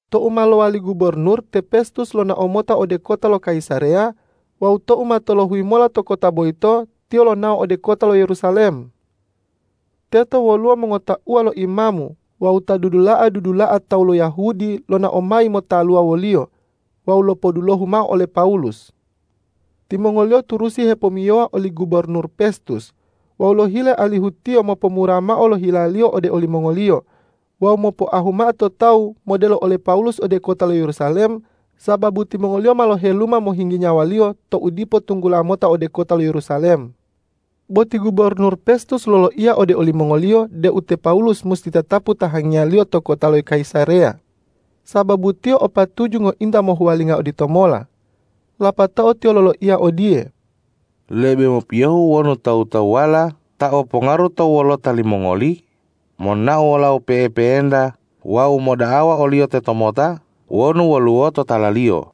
Tou ma lowali gubornur, te Pestus lonao mota ode kota lo Kayisareya wawu tou ma tolohuyi mola to kota boyito, tiyo lonao ode kota lo Yerusalem. Teto woluwo mongotauwa lo imamu wawu ta dudula'a-dudula'a tawu lo Yahudi lonao mayi motaluwa woliyo wawu lopodulohu mao ole Pawulus. Timongoliyo turusi hepomiyowa oli gubornur Pestus wawu lohile alihu tiyo mopomura mao lo hilaliyo ode olimongoliyo wawu mopoahu mao to tawu modelo ole Pawulus ode kota lo Yerusalem, sababu timongoliyo ma loheluma mohinggi nyawaliyo tou dipo tunggula mota ode kota lo Yerusalem. Bo ti gubornur Pestus loloiya ode olimongoliyo deu te Pawulus musi tatapu tahangiyaliyo to kota lo Kayisareya, sababu tiyo o patuju ngointa mohuwalinga oditomola. Lapatao tiyo loloiya odiye,”Lebe mopiyohu wonu tawu-tawuwala ta o pongaru to wolota limongoli monao wolau pe'epe'enta wawu moda'awa oliyo tetomota wonu woluwo totalaliyo.”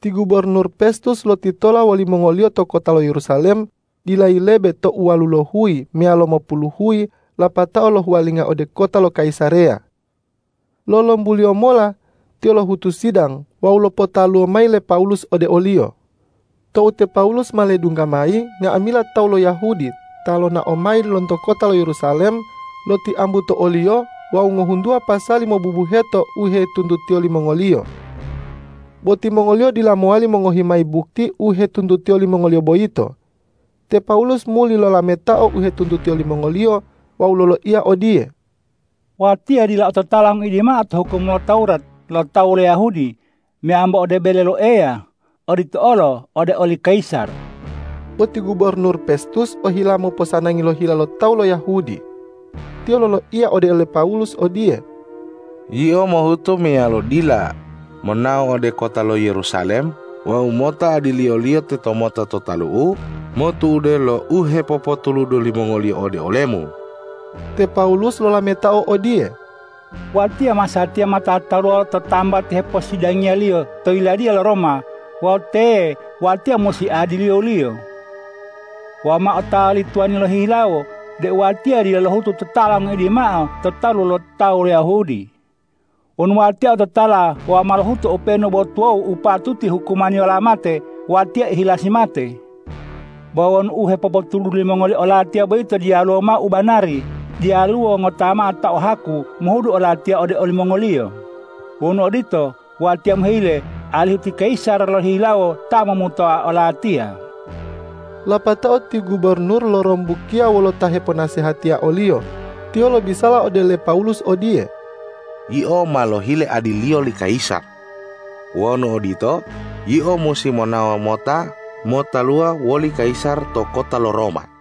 Ti gubornur Pestus lotitola wolimongoliyo to kota lo Yerusalem dila yilebe tou walulohuyi meyalo mopuluhuyi lapatao lohuwalinga ode kota lo Kayisareya. Lolombuliyo mola tiyo lohutu sidang wawu lopotaluwo mayi le Pawulus ode oliyo. Tou te Pawulus ma ledungga mayi, nga'amila tawu lo Yahudi ta lonao mayi lonto kota lo Yerusalem, lotiambu to oliyo wawu ngohuntuwa pasali mobubuheto u hetuntutiyo limongoliyo. Bo timongoliyo dila mowali mongohi mayi bukti u hetuntutiyo limongoliyo boyito. Te Pawulus muli lolametao u hetuntutiyo limongoliyo wawu loloiya odiye,”Watiya dila ototala ngoidi mao to hukum lo Tawurat lo tawu lo Yahudi meyambo ode bele lo Eya, odito olo ode oli kayisar.” Bo ti gubornur Petsus ohila moposanangi lo hila lo tawu lo Yahudi. Tiyo loloiya ode ole Pawulus odiye,”Yio mohuto meyalo dila, monao ode kota lo Yerusalem wawu mota adiliyoliyo tetomota to talu'u motu'ude lo u hepopotuludu limongoliyo ode olemu?” Te Pawulus lolametao odiye,”Watiya masatiya ma tataluwa lo tambati heposidangiyaliyo to yiladiya lo Roma wawu teye watiya musi adiliyoliyo. Wawu ma otawa li tuwani lohihilawo deu watiya dila lohutu totala ngoidi mao to talu lo tawu lo Yahudi. Wonu watiya ototala wawu ma lohutu openu bo tuwawu u patuti hukumaniyola mate, watiya ihilasi mate. Bo wonu u hepopotuludu limongoliyo olatiya boyito diyalu mao u banari, diyaluwo ngota mao ta o haku mohudu olatiya ode olimongoliyo. Wonu odito, watiya mohile alihu ti kayisar lohihilawo ta momutoa olatiya.” Lapatao ti gubornur lorombukiya wolo ta heponasehatiya oliyo. Tiyo lobisala ode le Pawulus odiye,”Yio ma lohile adiliyo li kayisar. Wonu odito, yio musi monao mota motaluwa woli kayisar to kota lo Roma.”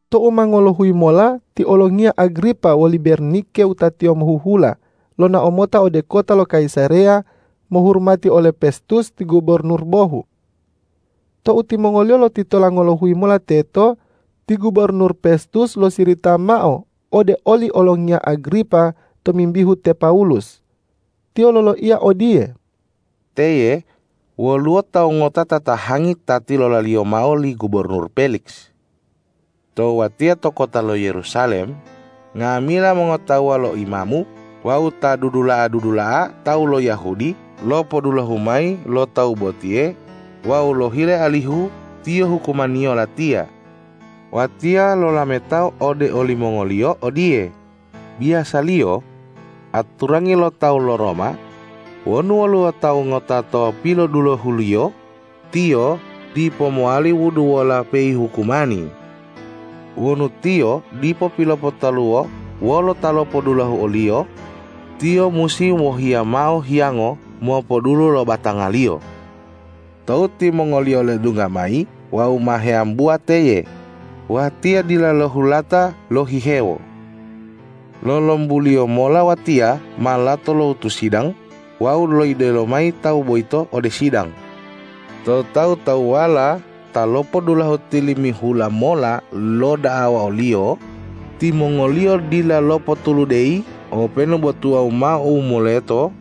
Tou ma ngolohuyi mola ti olongiya Agripa woli Bernike wutatiyo mohuhula lonao mota ode kota lo Kayisareya mohurumati ole Pestus ti gubornur bohu. Tou timongoliyo lotitola ngolohuyi mola teto, ti gubornur Pestus losirita mao ode oli olongiya Agripa tomimbihu te Pawulus. Tiyo loloiya odiye,”Teye woluwo tawu ngota ta tatahangi ta tilolaliyo mao li gubornur Peliks. Tou watiya to kota lo Yerusalem, nga'amila mongotauwa lo imamu wawu ta dudula'a-dudula'a tawu lo Yahudi lopodulohu mayi lo tawu botiye wawu lohile alihu tiyo hukumaniyo latiya. Watiya lolametao ode olimongoliyo odiye, ’Biyasaliyo aturangi lo tawu lo Roma wonu woluwo tawu ngota ta pilodulohuliyo, tiyo dipo mowali wuduwola peihukumani. Wonu tiyo dipo pilopotaluwo wolo ta lopodulohu oliyo, tiyo musi wohiya mao hiyango mopodulu lo batangaliyo. Tou timongoliyo ledungga mayi wawu ma heambuwa teye, watiya dila lohulata lohihewo. Lolombuliyo mola watiya ma lato lohutu sidang wawu loidelo mayi tawu boyito ode sidang. Tou tawu-tawuwala ta lopodulohu tilimihula mola loda'awa oliyo, timongoliyo dila lopotuludeyi openu bo tuwawu mao u moleto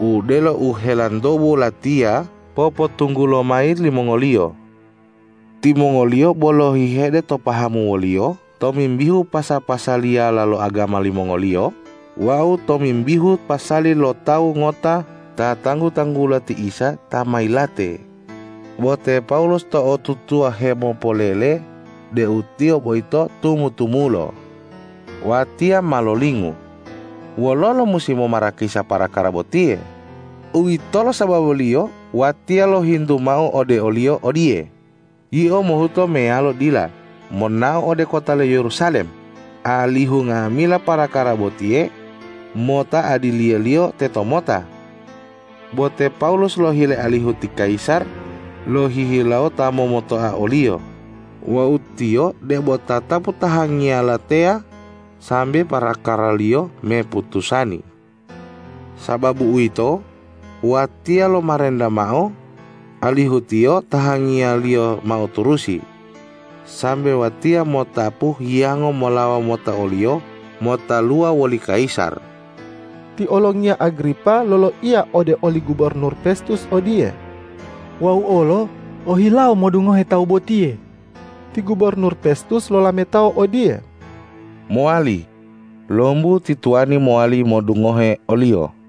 odelo u helantobu latiya popotunggulo mayi limongoliyo. Timongoliyo bo lohihede to pahamu woliyo tomimbihu pasa-pasaliyala lo agama limongoliyo wawu tomimbihu pasali lo tawu ngota ta tanggu-tanggula ti Isa ta ma yilate, bo te Pawulus to'otutuwa hemopolele deu Tiyo boyito tumu-tumulo. Watiya ma lolingu wololo musi momarakisa parakara botiye. Uwitolo sababuliyo watiya lohintu mao ode oliyo odiye, ’Yio mohuto meyalo dila, monao ode kota lo Yerusalem, alihu nga'amila parakara botiye mota adiliyoliyo tetomota?’ Bo te Pawulus lohile alihu ti kayisar lohihilawo ta momutoa oliyo wawu tiyo debo tatapu tahangiyala teya sambe parakaraliyo me putusani. Sababu uwito, watiya lomarenta mao alihu tiyo tahangiyaliyo mao turusi, sambe watiya mo'otapu hiyango molawo mota oliyo motaluwa woli kayisar.” Ti olongiya Agripa loloiya ode oli gubornur Pestus odiye,”Wau olo ohilawo modungohe tawu botiye.” Ti gubornur Pestus lolametao odiye,”Mowali, lombu ti tuwani mowali modungohe oliyo.”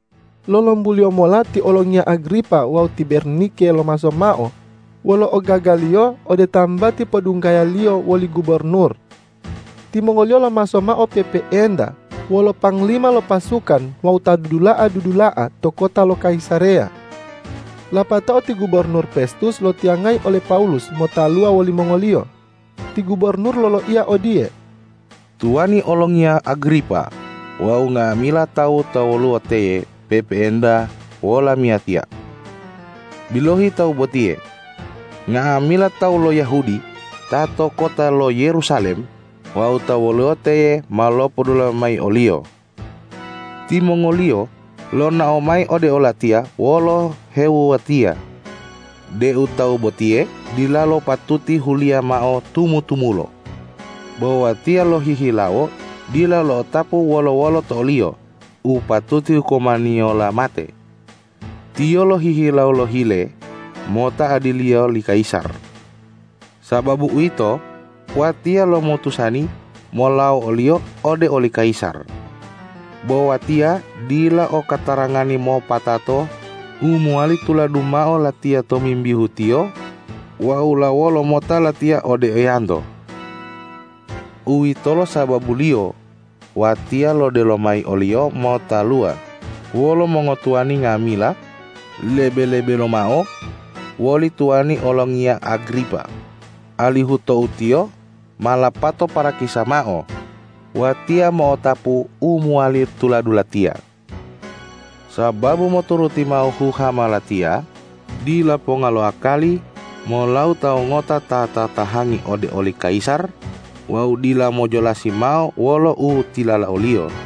Lolombuliyo mola ti olongiya Agripa wawu ti Bernike lomaso mao wolo ogagaliyo ode tambati podunggayaliyo woli gubornur. Timongoliyo lomaso mao pe'epe'enta wolo panglima lo pasukan wawu ta dudula'a-dudula'a to kota lo Kayisareya. Lapatao ti gubornur Pestus loitiyangayi ole Pawulus motaluwa wolimongoliyo. Ti gubornur loloiya odiye,”Tuwani olongiya Agripa wawu nga'amila tawu ta woluwo teye pe'epe'enta wolamiyatiya. Bilohi, tawu botiye. Nga'amila tawu lo Yahudi ta to kota lo Yerusalem wawu ta woluwo teye ma lopodulohu mayi oliyo. Timongoliyo lonao mayi ode olatiya wolo hewuwatia deu tawu botiye dilalo patuti huliya mao tumu-tumulo. Bo watiya lohihilawo dila lo'otapu wolo-wolo to oliyo u patuti hukumaniyola mate. Tiyo lohihilawo lohile mota adiliyo li kayisar. Sababu uwito, watiya lomutusani molawo oliyo ode oli kayisar. Bo watiya dila o katarangani mopatato u mowali tuladu mao latiya tomimbihu tiyo wawu lawolo mota latiya ode eyanto. Uwitolo sababuliyo watiya lodelo mayi oliyo motaluwa wolo mongotuwani nga'amila, lebe-lebe lomao woli tuwani olongiya Agripa, alihu tou tiyo ma lapato parakisa mao, watiya mo'otapu u mowali tuladu latiya. Sababu moturuti mao huhama latiya, dila ponga lo akali molawo tawu ngota ta tatahangi ode oli kayisar wawu dila mojolasi mao wolo u tilala oliyo.”